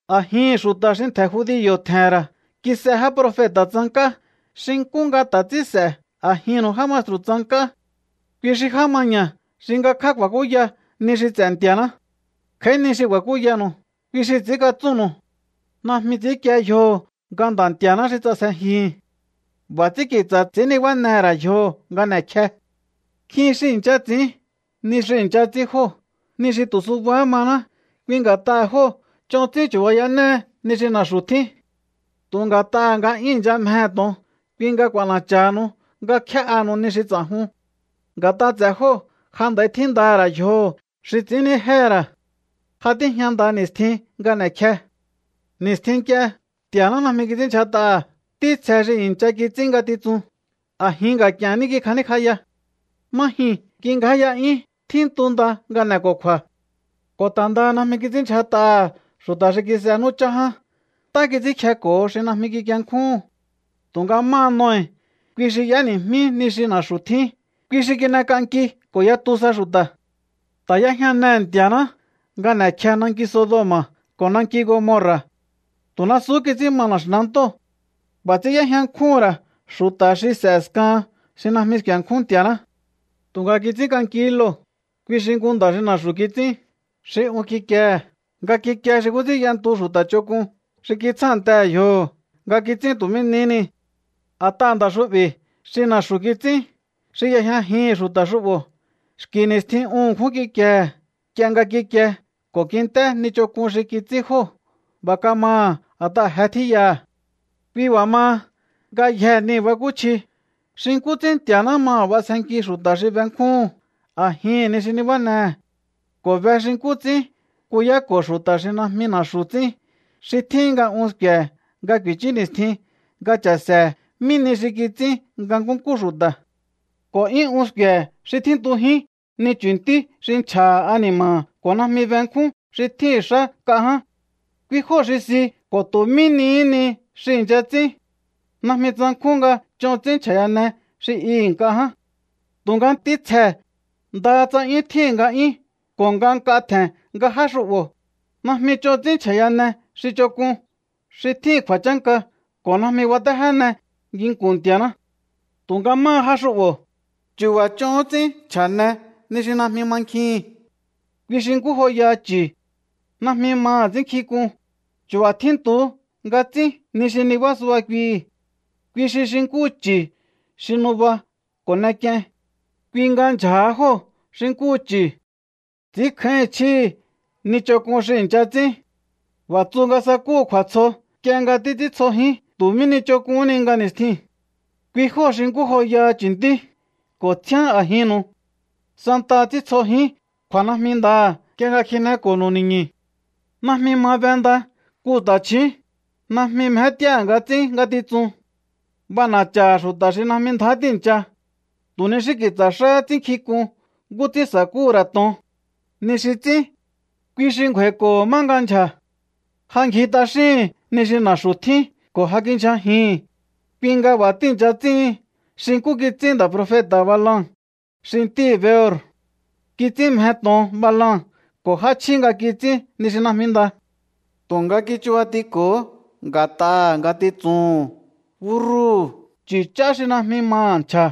A̱jihi̱n xu̱ta̱ xi ntje̱ judio̱ tje̱he̱n ra̱ kis'e já profeta̱ tsank'á, xi nkú nga ta̱ ts'ín s'e̱ a̱jinnu̱u já maestru̱ tsank'á. Kui xi já maña̱ xi ngakjá ku̱a̱kúya ni xi ts'e̱ Nti̱a̱ná. Kj'a̱í ni xi ku̱a̱kúyanu̱u, kui xi ts'i̱ínkatsúnnu̱u. Najmi ts'i̱ínkie yjoho̱ nga Nda̱ Nti̱a̱ná xi ts'asjejihi̱n. B'a̱ ts'ín ki̱tsa̱ ts'i̱ín nibánehe̱ ra̱ yjoho̱ nga n'e̱kje. Nkjin xi i̱ncha ts'i̱ín ni xi i̱ncha ts'ín jóo̱, ni xi tu̱ subahá maná. Kui nga̱t'aha̱ jóo̱ ch'on ts'ín chu̱bayanéhe ni xi na̱xu̱ tjín. Tu̱ nga̱t'aha̱ nga 'yún i̱ncha mjehe̱ to̱on, kui nga k'u̱a̱na̱cha̱ha̱nu̱u nga kjé'anu̱u ni xi ts'a̱jun. Nga̱t'a ts'e̱ jóo̱ ja nd'a̱i tjíndaha̱ ra̱ yjoho̱ xi ts'i̱ínnijéhe̱ ra̱. Ja tíjña nda ni̱stjin nga n'e̱kje. Ni̱stjin nk'ie Nti̱a̱ná najmi kits'ínndyjat'aha̱ ntítsje xi i̱ncha kits'ín ngatitsun. A̱jin nga̱k'i̱e̱n ní kikj'aníkj'aya. Má jyuu̱n kingjáya'yún, tjíntu nda nga n'e̱ko̱kju̱a̱. Ko̱ ta̱ ndaha najmi kits'ínndyjat'aha̱ xu̱ta̱ xi kis'e nú chá ján. Ntá kits'ínkjeko̱ho xi najmi kikienkjúhu̱n. Tu̱nga máha Noe, kui xi y'éni̱jmí ni xi na̱xu̱ tjín, kui xi kin'enk'anki ko̱ yatu sa xu̱ta̱. Ta̱ y'éjñanehe̱ Nti̱a̱ná nga n'e̱kje nanki Sodoma̱ ko̱ nanki Gomorra̱. Tu̱ nasuhú kits'ín ma na̱xi̱nantóo̱. B'a̱ ts'ín y'éjña nkjúhu̱n ra̱ xu̱ta̱ xi s'e̱ a̱skahan xi najmi sku̱e̱nkjún Nti̱a̱ná. Tu̱nga kits'ínk'ankihí Lot, kui xi nku nda̱ xi na̱xu̱ kits'ín, xi un kikiehe̱ nga kikie xi nkú ts'ín y'entu xu̱ta̱ ch'onk'un xi kitsjántehe̱ yjoho̱ nga kits'ín tu̱ mí nihí ni. A̱t'aha̱ nda̱ xu'bi̱ xi na̱xu̱ kits'ín, xi y'ejñajihi̱n xu̱ta̱ xu'bo̱, xki̱ ni̱stjin un ṉkjún kikiehe̱ nk'ie nga kikie ko̱ kint'é ni ch'onk'un xi kits'ín jóo̱. B'a̱ kamaha̱ a̱t'aha̱ je tjíyaha̱. Kui b'a̱ maha, ngayjee̱ nii̱ bakúchji xi nkú ts'ín Nti̱a̱ná maha̱ b'asjenki xu̱ta̱ xi benkjúhu̱n a̱jihi̱n ni xi nibánehe̱, ko̱ be xi nkú ts'ín kuyáko̱ xu̱ta̱ xi najmi na̱xu̱ ts'ín, xi tjíhin nga un sku̱e̱he̱ nga ku̱i̱chú ni̱stjin nga cha̱se̱he̱ mí nihi xi kits'ín nga nkúnkú xu̱ta̱. Ko̱ 'yún un sku̱e̱he̱ xi tjíntujín ni chu̱ntí xi nchja̱ha̱ ani̱ma̱ha̱ ko̱ najmi benkjún xi tjíhi̱n xá nk'a ján. Kui jóo̱ xi si ko̱ tu̱ mí nihí ni xi i̱ncha ts'ín. Najmi tsankjún nga ch'on ts'ín nchja̱yane xi i nk'a ján. Tu̱nga ntítsjee̱, ndaha tsa 'yún tjíhi̱n nga'yún ko̱ nga nk'a tje̱n nga já xu'bo̱, najmi ch'on ts'ín nchja̱yane xi ch'onk'un xi tjíhi̱n kju̱a̱chánka ko̱ najmi batéjéne nginku̱n Nti̱a̱ná. Tu̱nga máha já xu'bo̱, chu̱ba̱ ch'ohón ts'ín nchja̱ne ni xi najmi mankjihi̱n. Kui xi nkú joyaha chu̱. Najmi maha̱ ts'ínnkjink'un. Chu̱ba̱ tjíntuhú nga ts'ín ni xi nibá suba kuihi̱. Kui xi xi nkúhu chu̱ xi nuba ko̱ n'ek'ien. Kui nga ndyja̱ha jóo̱ xi nkúhu chu̱. Ts'i̱ínkjáíhi̱n chjíhi̱ ni ch'onk'un xi i̱ncha ts'ín. B'a̱ tsu nga sakúhu̱ kju̱a̱tsjo nk'ie nga títs'íntsjojín tu̱ mí ni ch'onk'uhún ni nga ni̱stjiu̱n. Kui jóo̱ xi nkú joyaha chu̱ntí ko̱ tsjíán a̱jinnu̱u. Santaha ts'íntsjojín kju̱a̱najmindaha̱ nk'ie nga kjineko̱nu̱u ni̱ñu̱. Najmi ma be nda nku ta̱chju̱ún. Najmi mjét'íáha̱ nga ts'ín ngatitsun. B'ana̱cha̱ha̱ xu̱ta̱ xi najmi ndjá tíi̱ncha. Tu̱ ni xí ki̱tsa̱ xáhá ts'ínnkjink'un nkú ts'ín sa̱kúhu̱ ra̱ to̱on. Ni xi ts'ín, kui xi ngju̱a̱i̱ko̱ho̱ má nga ndyja̱. Ja ngji t'axíhi̱n ni xi na̱xu̱ tjín ko̱ ja kindyjajihi̱n, kui nga b'a̱ tíi̱ncha ts'íhin xi nkú kits'ín nda̱ profeta̱ Balaam xi ntíhi̱ Beor. Kits'ín mje to̱on Balaam ko̱ j'áchjí nga kits'ín ni xi najmi nda. Tu̱nga kichubatiko̱hó nga̱t'aha̱ ngatitsuhu̱n. Búrrúhu̱, chu̱ ch'á xi najmi maha̱ nchja̱,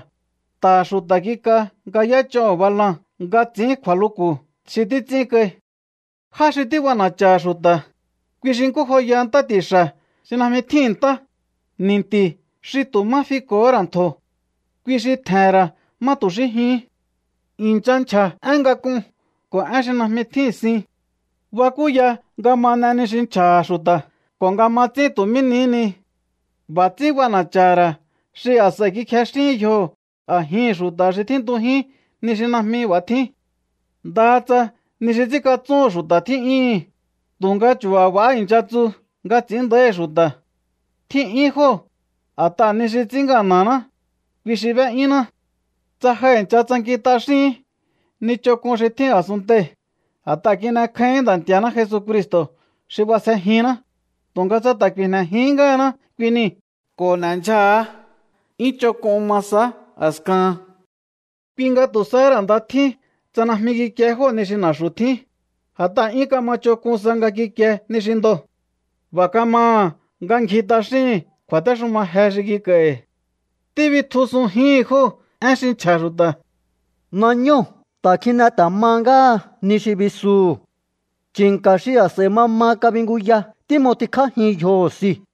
nta̱ha̱ xu̱ta̱ kik'a nga y'éch'oho̱ Balaam nga ts'i̱ín kju̱a̱luku̱ xi títs'ín kai. Já xi tíb'ana̱cha̱ha̱ xu̱ta̱, kui xi nkú joyaha ntá ti̱xa̱ xi najmi tjíhi̱n ntá, ni̱nti̱ xi tu̱ má fiko̱hó ra̱ ntjo̱. Kui xi tje̱he̱n ra̱ má tu̱ xí jyuhún. I̱ncha nchja̱ én ngak'un ko̱ én xi najmi tjíhi̱n sin. Bakúya nga ma n'e ni xi nchja̱ha̱ xu̱ta̱ ko̱ nga ma ts'ín tu̱ mí nihí ni. B'a̱ ts'ín b'ana̱cha̱ha̱ ra̱ xi a̱s'a̱i kikjexíhín yjoho̱ a̱jihi̱n xu̱ta̱ xi tjíntujín ni xi najmi b'a̱ tjín. Ndaha tsa ni xi ts'ínkatsúhu̱n xu̱ta̱ tjí'yúhu̱n, tu̱nga chu̱ba̱ b'a̱há i̱ncha tsu nga ts'i̱ín nda̱íhi̱ xu̱ta̱. Tjí'yún jóo̱, a̱t'aha̱ ni xi ts'ín ngana̱ná, kui xi b'é'yúnná. Tsa ja i̱ncha tsankin t'axíhi̱ín ni ch'onk'un xi tjín asunntei̱ a̱t'aha̱ kin'ekjáíhi̱ín Nda̱ Nti̱a̱ná Jesucristo̱ xi b'asjejinná, tu̱nga tsa ta̱ ku̱i̱jne̱jihín ngáhaná kui niu̱ ko̱ n'e̱ndyjaha̱á, 'yún ch'onk'un ma sahá a̱kahan. Kui nga tu̱ sahá ra̱ nda tjín tsa najmi kikie jóo̱ ni xi na̱xu̱ tjín, a̱t'aha̱ 'yún kama ch'onk'un sa nga kikie ni xi ndoo̱. B'a̱ kamaha̱ nga ngji t'axíhi̱n kju̱a̱téxuma je xi kik'a̱i̱hi̱. Tíbitjusunjíhi̱n jóo̱ én xi nchja̱ xu̱ta̱: “Nañóo̱ ta̱ kjine ta̱ ma ngáha ni xi bisuhu̱. Chi̱nka̱ xi a̱s'a̱i mama kabinguya tím'otikjájin yjoho̱ siu̱.”